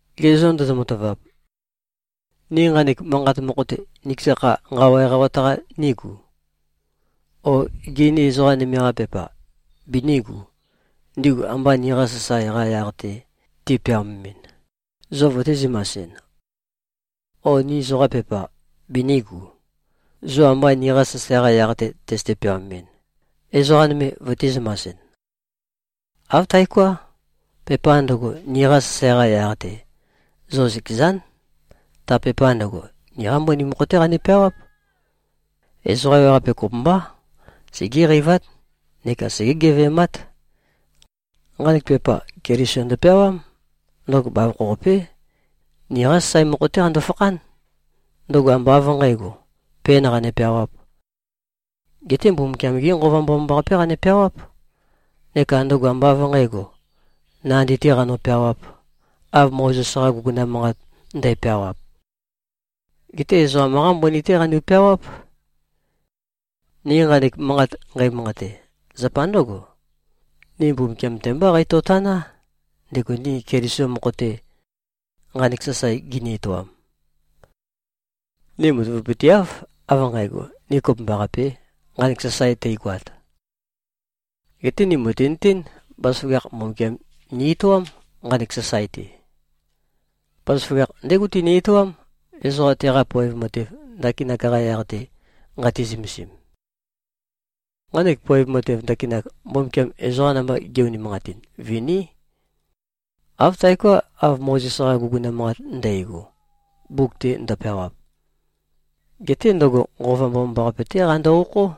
Ge zô, ndozo-matavap? Ni nqanek manqat mokho-te, nikeza kha nqawa eqawat-qa nígu? O gê, ni ezoqa nøme-qa pepa binígu, ndigu amba niqa sasae-qa yaq-te ti꞉peaomemɨn, zo vøtī-zømasɨn? O ni zoqa pepa binígu, zo amba niqa sasae-qa yaq-te tøzøte-peaomemɨn, ezoqa nøme vøtī-zømasɨn? Āv taoká. Pepa ndøgo, niqa sasae-qa yaq-te, zo zøkezán. Ta pepa ndøgo, niqá mbøni mokho-té qanu꞉-peawáp. Ezoqa ewaqape kopømbá, segéqeivát neka segé-geve꞉mát. Nqanek pepa Keliso ndøpeawám. Ndøgo bavokho-qapé. Niqa sasae mokho-té qando-fakhán. Ndøgo ambá av nqǣgo, pēn qane-peawāp. Geté Mbumbukiam-gé Nqova Mbomambaqapé qane-peawáp. Neka ndøgo ambá av nqǣgo, nandi-tē qano-peawāp, av Mozes-qa guguna manqat ndæpeawap. Geté ezoqam-qá mbøni-té qanu꞉-peawáp. Ni nqanek manqat nqeimanqate, zapa ndǿgo. Ni Mbumbukiam-te mbá qeitøtaná, ndego ni Keliso mokho-te nqanek sasae gini-etoam. Ni matavapøteáv, av nqægo, ni kopømbaqapē, nqanek sasae teigoat. Geté ni mø̀tinøtén, bazaføgakh Mbumbukiam ni-etoám, nqanek sasae-te. Bazaføgakh ndégo tini-etoám, ezoqa teqa poev matev ndakinak-qa yaq-te nqati-zømesim. Nqanek poev matev ndakinak, Mbumbukiam ezoqa namba ge꞉-unimanqatin, viní. Āv taoká, av Mozes-qa guguna manqat ndægo, mbuk-te ndøpeawap. Geté ndøgo, Nqova Mbomambaqape-té qando-okhó.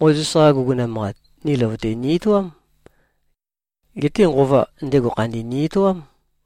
Mozes-qa guguna manqat, ni løvøte ni-etoám. Geté Nqova, ndego khandi ni-etoám.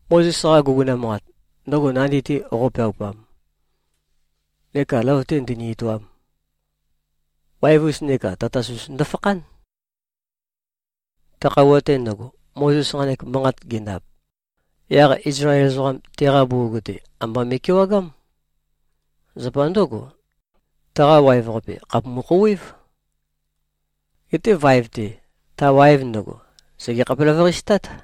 Mozes-qa guguna manqat, ndøgo nandi-te qo꞉peaupam, neka løvøte ndøni-etoam, waev-us neka tatas-us ndofakhán. Ta khøuwa-te ndøgo, Mozes nqanek manqat gendap, yaq Izlael ezoqam teqa bugug-te, amba me꞉kewagám. Zapa ndǿgo, taqa waev-qape, khàpumu-khouwév. Geté vaev-te, ta waev ndøgo, sège-khapelavøqase-tát.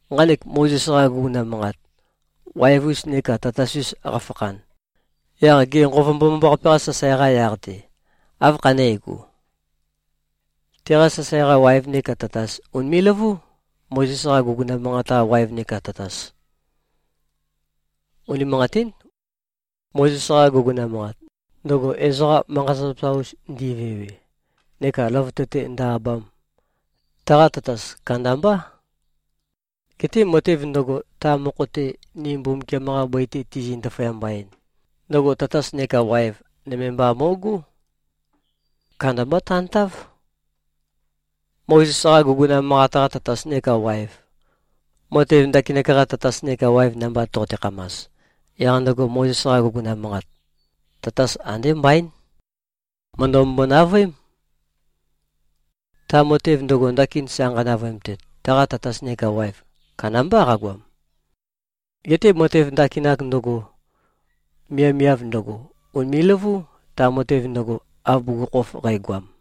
Nqanek Mozes-qa guguna manqat, waev-us neka tatas-us qafakhan, yaq gê, Nqova Mbomambaqape-qa sasae-qa yaq-te, áv khané꞉go? Teqa sasae-qa waev neka tatas ùnime꞉-løvú, Mozes-qa guguna manqat-qa waev neka tatas. Unimanqatín. Mozes-qa guguna manqat, ndøgo ezoqa manqa-zapazapa-us ndivewe neka løvøte-te ndø-abam, taqa tatas kandambá. Geté matev ndøgo, ta mokho-te ni Mbumbukiam-qa bøi-te tizi꞉-ndaføyamba-en, ndøgo tatas neka waev nøme mba mo꞉gó. Kandambá tantáv. Mozes-qa guguna manqat-qa tatas neka waev, matev ndakinak-qa tatas neka waev namba toqote-khamas, yaq ndøgo Mozes-qa guguna manqat, tatas andé mbaín. Mø̀ndømømbo-navøém. Ta matev ndøgo, ndakin sa nqanavøemtet, taqa tatas neka waev kandambá qagoam. Geté matev ndakinak ndøgo, miavmiav ndøgo, ùnime꞉-løvú, ta matev ndøgo, av bugukhokhof qægoam.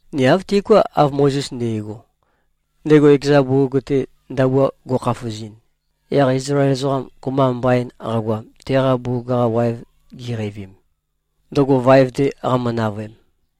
Ni āv tiuká, av Mozes nde꞉go, ndego ekeza bugug-te ndabua go꞉khafuzɨn, yaq Izlael ezoqam kopømba mbain qagoam, teqa bugug-qa waev giqeivim, ndøgo vaev-te qamø-navøem.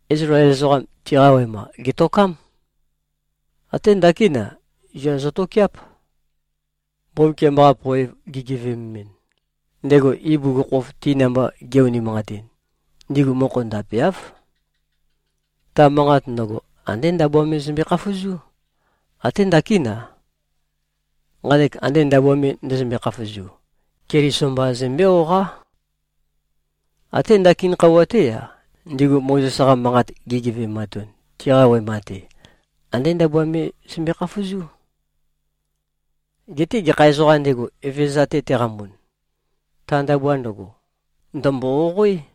Izlael ezoqam, tiqa wema gètokám. Até ndakín-a, zua zøtokeáp. Mbumbukiam-qa poev gigeveømemɨn, ndego ibugukhokhof ti namba ge꞉-unimanqatin, ndigu mokho ndapemáv. Ta manqat ndøgo, andé ndabua me zømbe-khafuzú. Até ndakín-a. Nqanek ande ndabua me ndøzømbe-khafuzu, Keliso mba zømbé-oqoá. Até ndakin khøuwa-té-a, ndigu Mozes-qa manqat gigeve꞉matun, tiqa wema-te, andé ndabua me zømbe-khafuzú. Geté gekha ezoqām ndego, Evezøza-te teqambun, ta ndabua ndøgo, ndø̀mbo-oqoé.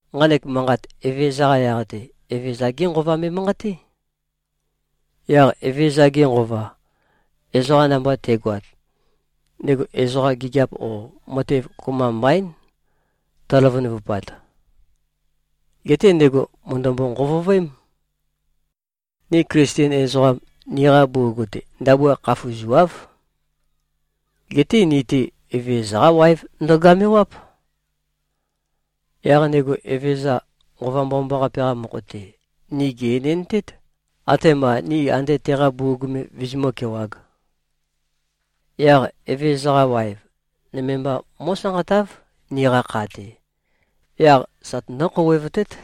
Nqanek manqat Evezøza-qa yaq-te, Evezøza-gé Nqova me꞉manqaté. Yaq Evezøza-ge Nqova, ezoqa namba te꞉goat, ndego ezoqam, gigiap o matev kopømba mbaín tøløvønøvupat. Geté ndego mø̀ndømbo-nqovovøém. Ni Klisten ezoqam, niqa bugug-te ndabua khafuzuáv. Geté ni-te, Evezøza-qá waev ndogamewáp. Yaq ndego Evezøza, Nqova Mbomambaqape-qa mokho-te, ni gè-enendtét, atema ni ande teqa bugug me vizimǿ-kewāg. Yaq Evezøza-qa waev, nøme mba mó꞉sanqatáv, niqa kha-te. Yaq sa tønǿ-khouwevtét.